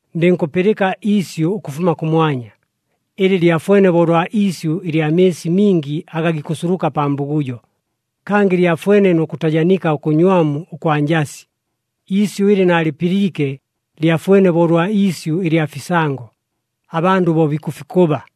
Ndɨnkʉpɨlɨka iisyʉ ʉkʉfuma kʉmwanya, ɨlɨ lyafwene bo ʉlwa iisyʉ ɨlya mɨɨsi mingi aga gikʉsuluka pa mbugujo, kangɨ lyafwene nʉ kʉtajanika ʉkʉnywamu ʉkwa njasi. Iisyʉ ɨlɨ naalɨpɨliike lyafwene bo ʉlwa iisyʉ ɨlya fisango, abandʉ bo bikʉfikʉba.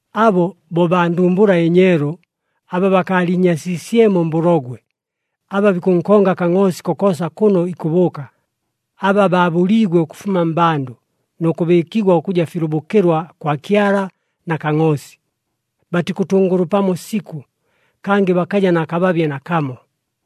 Abo bo baa ndumbula ɨnyeelu, aba bakaaliinyasiisyemo mbʉlogwe. Aba bikʉnkonga Kangʼoosi kokoosa kʉno ikʉbʉʉka. Aba baabʉliigwe ʉkʉfuma mmbandʉ, nʉ kʉbɨɨkigwa ʉkʉja filʉbʉkɨlwa kwa Kyala na Kangʼoosi. Batikʉtʉngʉlʉpamo sikʉ, kangɨ bakaja na kababye nakamo.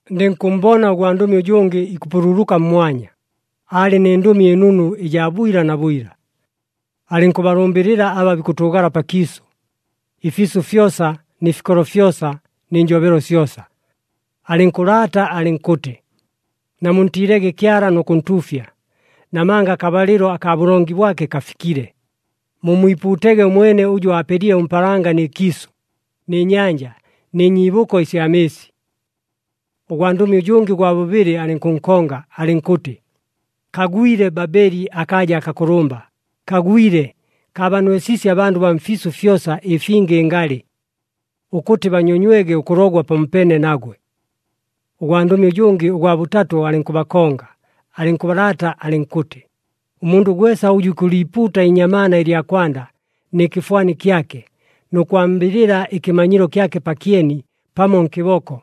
Ndɨnkʉmmbona ʉgwandʉmi ʉjʉngɨ ikʉpululuka mmwanya, aalɨ nɨ Ndʉmi ɨNunu ɨjaa bwila na bwila. Alɨnkʉbalʉmbɨlɨla aba bikʉtʉʉgala pakiisʉ, ɨfiisʉ fyosa nɨ fikolo fyosa nɨ njobelo syosa. Alɨnkʉlaata alɨnkʉtɨ, “Namuntiilege Kyala nʉ kʉntuufya, namanga akabalɨlo akaa bʉlongi bwake kafikile. Mummwipuutege ʉmwene ʉjʉ aapelile ʉmpaalanga nɨ kiisʉ, nɨ nyanja, nɨ nyiibʉko ɨsya mɨɨsi.” Ʉgwandʉmi ʉjʉngɨ ʉgwa bʉbɨlɨ alɨnkʉnkonga, alɨnkʉtɨ, “Kagwile Babeli akaaja akakʉlʉmba! Kagwile! Kaabanwesiisye abandʉ baa mfiisʉ fyosa ɨfinga ɨngalɨ. Ʉkʉtɨ banyonywege ʉkʉlogwa pamopeene nagwe.” Ʉgwandʉmi ʉjʉngɨ ʉgwa bʉtatʉ alɨnkʉbakonga, alɨnkʉlaata alɨnkʉtɨ, “Ʉmundʉ gwesa ʉjʉ ikʉliipuuta iinyamaana ɨlya kwanda nɨ kɨfwani kyake, nʉ kwambɨlɨla ɨkɨmanyilo kyake pakyeni, pamo nkɨboko,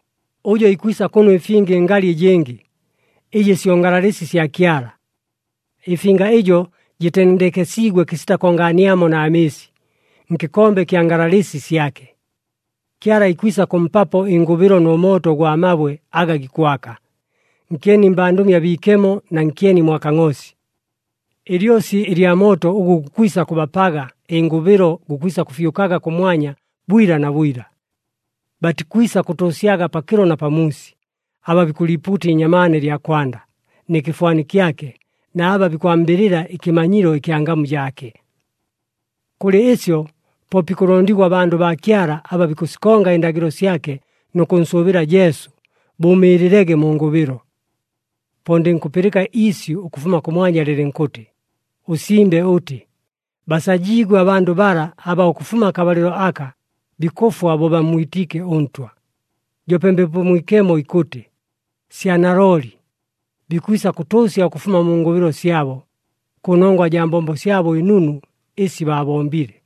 ʉjo ikwisa kʉnwa ɨfinga ɨngalɨ ɨjɨngɨ, ɨjɨ syo ngalalɨsi sya Kyala. Ɨfinga ɨjo jɨtendekesiigwe kɨsita kongaaniamo na mɨɨsi, nkɨkombe ɨkya ngalalɨsi syake. Kyala ikwisa kʉmpapo ɨngʉbɨlo nʉ mooto ʉgwa mabwe aga gikwaka, nkyeni mbandʉmi abiikemo, na nkyeni mwa Kangʼoosi. Ɨlyosi ɨlya mooto ʉgʉ gukwisa kʉbapaga ɨngʉbɨlo gukwisa kʉfyʉkaga kʉmwanya bwila na bwila. Batikwisa kʉtʉʉsyaga pakɨlo na pamuusi, aba bikʉliipuuta iinyamaana ɨlya kwanda, nɨ kɨfwani kyake, na aba bikwambɨlɨla ɨkɨmanyilo ɨkya ngamu jaake.” Kʉlɨ ɨsyo, po bikʉlondigwa abandʉ baa Kyala, aba bikʉsikonga ɨndagɨlo syake nʉ kʉnsʉʉbɨla Jesu, bʉʉmɨɨlɨlege mu ngʉbɨlo. Po ndɨnkʉpɨlɨka iisyʉ ʉkʉfuma kʉmwanya, lɨlɨnkʉtɨ, “Ʉsimbe ʉtɨ, basajiigwe abandʉ bala, aba ʉkʉfuma akabalɨlo aka, bikʉfwa bo bammwitiike ʉNtwa.” Joope Mbepo Mwikemo ikʉtɨ, “Sya nalooli! Bikwisa kʉtʉʉsya ʉkʉfuma mu ngʉbɨlo syabo, kʉnongwa jaa mbombo syabo ɨnunu ɨsi baabombile.”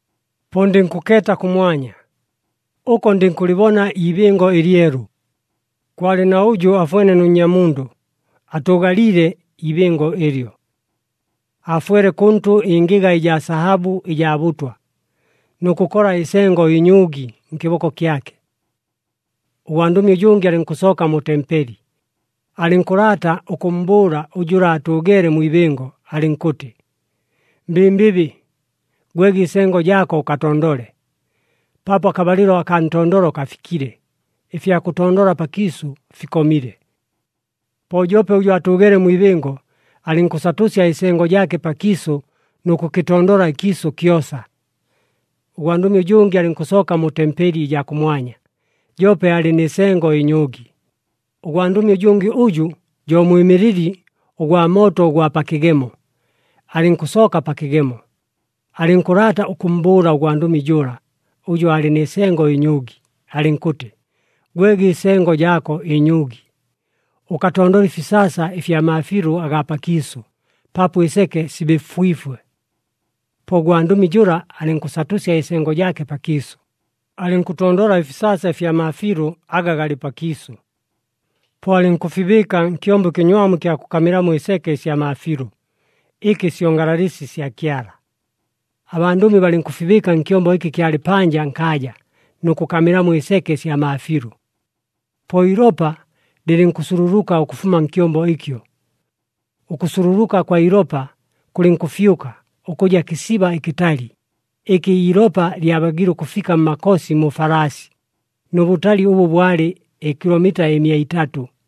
Po ndɨnkʉkeeta kʉmwanya. Ʉko ndɨnkʉlɨbona iibɨngo ɨlyelu. Kwalɨ na ʉjʉ afwene nʉ Nnyamundʉ atʉʉgaliile ibɨngo ɨlyo. Aafwele kʉntʉ ɨngɨga ɨjaa sahabʉ ɨjaa bʉtwa, nʉ kʉkola ɨsengo ɨnyʉʉgi nkɨboko kyake. Ʉgwandʉmi ʉjʉngɨ alɨnkʉsooka mu tempeli, alɨnkʉlaata ʉkʉmmbʉʉla jʉla atʉʉgeele mwi ibɨngo, alɨnkʉtɨ, “Mbɨmbɨbɨ, gwege ɨsengo jaako, ʉkatondole, paapo akabalɨlo akaa ntondolo kafikile, ɨfya kʉtondola pakiisʉ fikomile.” Po joope ʉjʉ aatʉʉgeele mwi ibɨngo alɨnkʉsatʉsya ɨsengo jaake pakiisʉ nʉ kʉkɨtondola ɨkiisʉ kyosa. Ʉgwandʉmi ʉjʉngɨ alɨnkʉsooka mu tempeli ɨjaa kʉmwanya, joope aalɨ nɨ sengo ɨnyʉʉgi. Ʉgwandʉmi ʉjʉngɨ ʉjʉ jo mwɨmɨlɨli ʉgwa mooto ʉgwa pa kɨgemo, alɨnkʉsooka pa kɨgemo. Alɨnkʉlaata ʉkʉmmbʉʉla ʉgwandʉmi jʉla, ʉjʉ aalɨ nɨ sengo ɨnyʉʉgi, alɨnkʉtɨ, “Gwege ɨsengo jaako ɨnyʉʉgi. Ʉkatondole ɨfisaasa ɨfya maafiilʉ agaa pakiisʉ, paapo ɨseke sibɨfwifwe.” Po ʉgwandʉmi jʉla alɨnkʉsatʉsya ɨsengo jaake pakiisʉ, alɨnkʉtondola ɨfisaasa ɨfya maafiilʉ aga galɨ pakiisʉ. Po alɨnkʉfibɨɨka nkyombo ɨkɨnywamu ɨkya kʉkamɨlamo ɨseke ɨsya maafiilʉ, ɨkɨ syo ngalalɨsi sya Kyala. Abandʉmi balɨnkʉfibɨɨka nkyombo ɨkɨ kyalɨ panja nkaaja, nʉ kʉkamɨlamo ɨseke ɨsya maafiilʉ. Po iilopa lɨlɨnkʉsululuka ʉkʉfuma nkyombo ɨkyo. Ʉkʉsululuka ʉkwa ilopa kʉlɨnkʉfyʉka, ʉkʉja kɨsiba ɨkɨtali, ɨkɨ iilopa lyabagiile ʉkʉfika mmakosi mu falaasi, nʉ bʉtali ʉbʉ bwalɨ ɨkilomita ɨmia itatʉ.